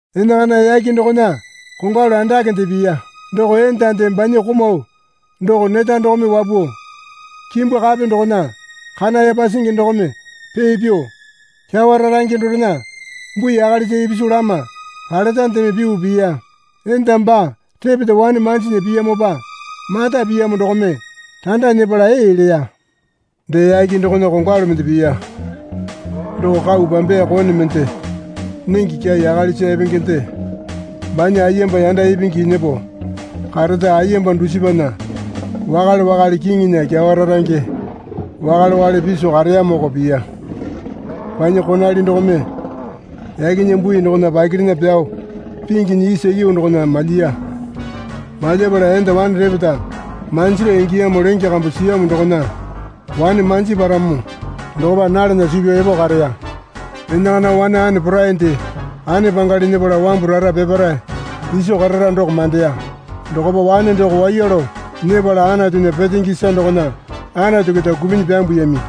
Enakana yake dokona kongwalu andakende piya. Doko endande banya komau doko neta dokome wapuo, kimbu kape dokona kana yapa singi dokome pee pyuo, kyawa rarange dorena bui akalisa ipisu lama paletandeme pyuo piya. Enda baa repeta wane manjinya piyamopa mata piyamo dokome randa nyepala ee leya. Dee yake dokona kongwalu mende piya. Doko kau pambeya kone mende nenge kyai akalisa epengende banya ayemba yanda ipingi nyepo kareta ayemba dusipana wakale wakale kiŋinya kyawa rarange wakale wakale piso kareyamoko piya. Banya konali dokome yakena bui dokona pakirena pyao pingyanyi isa yuu dokona malyiya. Malyapala enda wane repeta manjira ingiyamo lenge kambu siyamo dokona wane manji paramo dokopa nalana suu pyao epo kareya. Enakana wane ane porainde ane pangali nyepala wambu rara peparae iso karara doko mandeya. Dokopa wane doko waiya lao nyepala Anatunya petenge isa dokona Anatu keta kupinyi pyambuyami.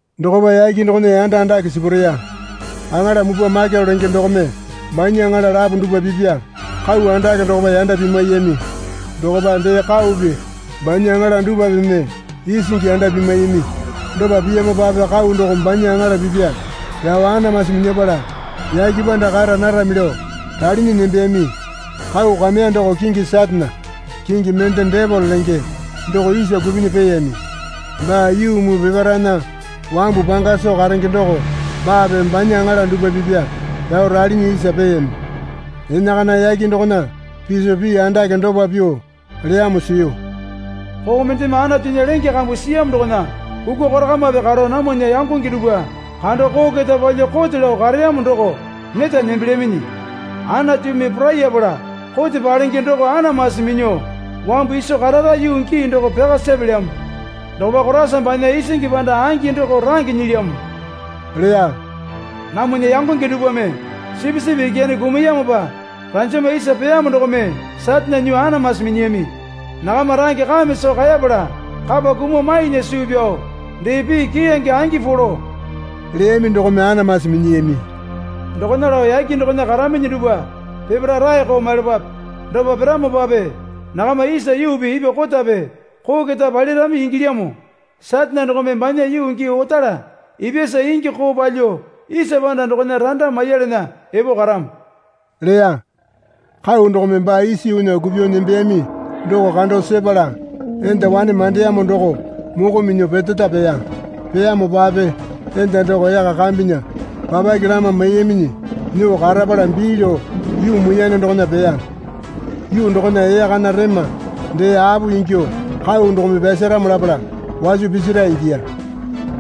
Dokopa yake dokona yanda andake sipureya. Aŋala mupwa Maikele lenge dokome banya aŋala lapo dupwa pipa kau andake dokopa yanda pimwaiyami. Dokopa dee kaupi banya aŋala dupwapeme isingi yanda pimwaiyami. Dopa piyamopape kau doko banya aŋala pipa pyao anamasi minyapala yake panda kara narami lao ralinyi nembeyami. Kau kameya doko kingi Satane kingi mende Depele lenge doko isa kupinyi peeyami. Baa yuu muu peparaena wambu panga soo karenge doko baape banya aŋala dupwa pipa pyao ralinyi isa peyami. Enakana yake dokona piso pii andake dopa pyuo leyamo siyu. Koo mendeme Anatunya lenge kambu siyamo dokona kukwa korakamape karo namwana yangonge dupwa kando koo keta palyuo kote lao kareyamo doko neta nembelyaminyi. Anatumi porayapala kote palenge doko anamasi minyuo wambu iso karara yuu gii doko pyaka sepelyamo. Dokopa Koraisa banya isingi panda angi doko range nyilyamo, leya. Namwana yangonge dupwame Sipisipi Ikyane kumuyamopa ranjama isa peyamo dokome Satane nyuo anamasi minyiyami. Nakama range kame soo kaepala kapa kumuo mainya suu pyao, dee pii keyange angi polo leyami dokome anamasi minyiyami. Dokona lao yake dokona karaminyi dupwa peparae raeko maiyalapape. Dopa piramopape nakama isa yuupi ipwa kotape koo keta palirami ingilyamo. Satane dokome banya yuu gii otala ipyasa ingi koo palyuo isa panda dokona randa maiyalana epo karamo leya. Kau dokome baa isa yuunya kupyuo nembeyami doko kando sepala enda wane mandeyamo doko moko minyuo peteta peya. Peyamopape enda doko yaka kambena papake lama maiyaminyi nyuo karapala bii lao yuu muiyane dokona peya. Yuu dokona ee kana rema dee apo ingyuo kau dokome pyasaramo lapala waso pisira ingiya.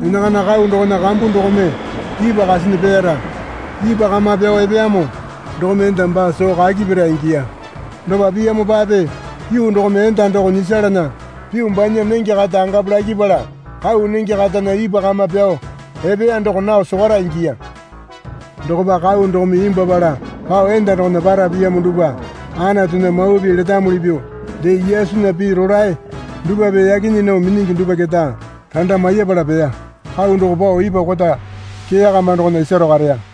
Enakana kau dokona kambu dokome ipwa kasinyi peeyara ipwa kama pyao epeyamo dokome enda baa soo kaki pira ingiya. Dopa piyamopape yuu dokome enda doko nyisalana pyuo banya nenge kata angapu lakipala kau nenge katana ipwa kama pyao epeya doko nao sokwara ingiya. Dokopa kau dokome imbwuapala pao enda dokona para piyamo dupwa Anatunya mawa pii letamuli pyuo dee Yesunya pii rolae dupwape yaki nyii nao minyingi dupwa keta randa maiyapala peya. Kau doko pao ipwa kota kee kama dokona isaro kareya.